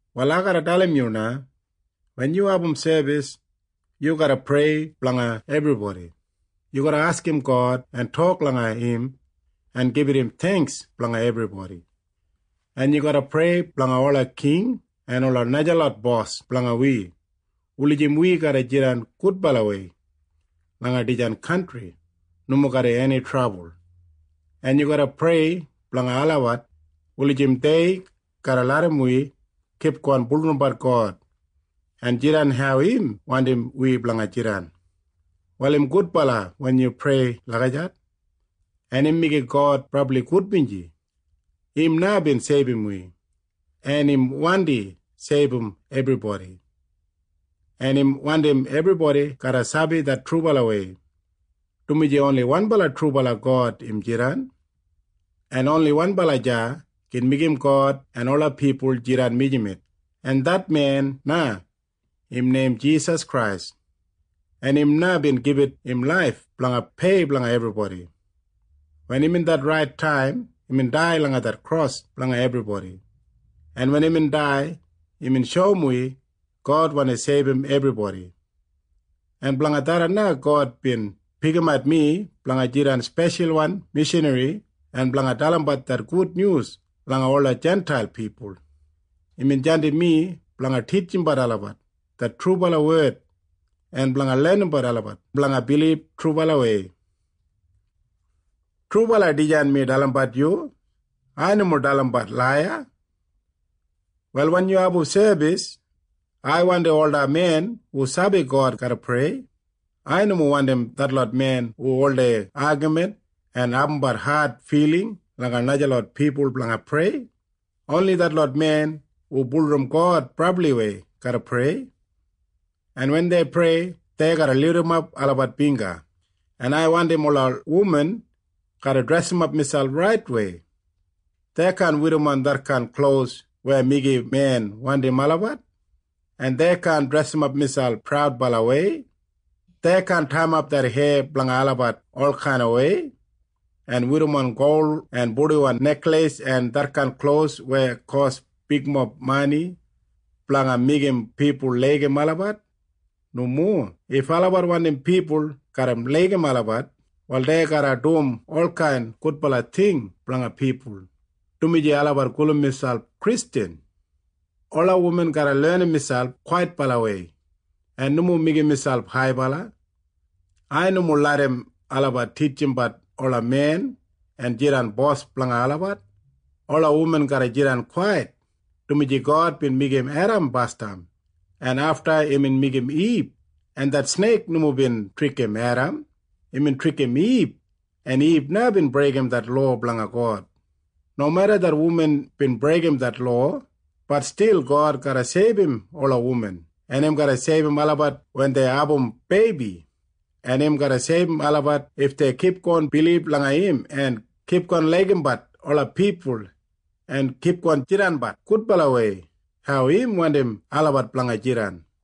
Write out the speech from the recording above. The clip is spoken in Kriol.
Wal ai garra dalim yu na. Wen yu abum sebis, yu garra prei blanga ebribodi. Yu garra askim God en tok langa im en gibit im theingks blanga ebribodi, en yu garra prei blanga ola king en ola najalot bos blanga wi wulijim wi garra jidan gudbalawei langa dijan kantri nomo garram eni trabul. En yu garra prei blanga olabat wulijim dei garra larram wi kipgon bulurrumbat God en jidan hau im wandim wi blanga jidan. Wal im gudbala wen yu prei lagijat, en im meigim God brabli gudbinji. Im na bin seibum wi, en im wandi seibum ebribodi, en im wandim ebribodi garra sabi det trubalawei, dumaji oni wanbala trubala God im jidan, en oni wanbala deya gin meigim God en ola pipul jidan mijamet, en det men na im neim Jisas Krais. En im na bin gibit im laif blanga pei blanga ebribodi. Wen imbin det rait taim, imbin dai langa det kros blanga ebribodi, en wen imbin dai, imbin shoum wi God wandi seibum ebribodi, en blanga tharran na God bin pikimat mi blanga jidan speshalwan mishanri en blanga dalimbat det gudnyus langa ola Jintail pipul. Imbin jandim mi blanga titjimbat olabat det trubala wed en blanga lenimbat olabat blanga bilib trubalawei. Trubala dijan mi dalimbat yu. Ai nomo dalimbat laiya. Wal wen yu abum sebis, ai wandim ola men hu sabi God garra prei. Ai nomo wandim detlot men hu oldei agamin en abumbat ad filing langa najalot pipul blanga prei. Oni detlot men hu bulurrum God brabliwei garra prei. En wen dei prei, dei garra lidimap olabat bingga. En ai wandim ola wuman garra dresimap miselp raitwei. Dei kaan werrimon detkain klos weya meigim men wandim olabat, en dei kaan dresimap miselp praudbalawei. Dei kaan taiyimap det heya blanga olabat olkainwei en werrimon gol en purdiwan nekleis en detkain klos weya kos bigmob mani blanga meigim pipul laigim olabat. Nomo. If olabat wandim pipul garra laigim olabat, wal dei garra dum olkain gudbala ting blanga pipul, dumaji olabat gulum miselp Kristjan. Ola wuman garra lenim miselp kwaitbalawei en nomo meigim miselp haibala. Ai nomo larram olabat titjimbat ola men en jidan bos blanga olabat. Ola wuman garra jidan kwait, dumaji God bin meigim Edam basdam, en afta imbin meigim Ib, en det sneik nomo bin trikim Edam. Imbin trikim Ib, en Ib na bin breigim det lowa blanga God. Nomeda det wuman bin breigim det lowa, bat stil God garra seibum ola wuman. Im garra seibum olabat wen dei abum beibi, en im garra seibum olabat if dei kipgon bilib langa im en kipgon laigimbat ola pipul en kipgon jidanbat gudbalawei hau im wandim olabat blanga jidan.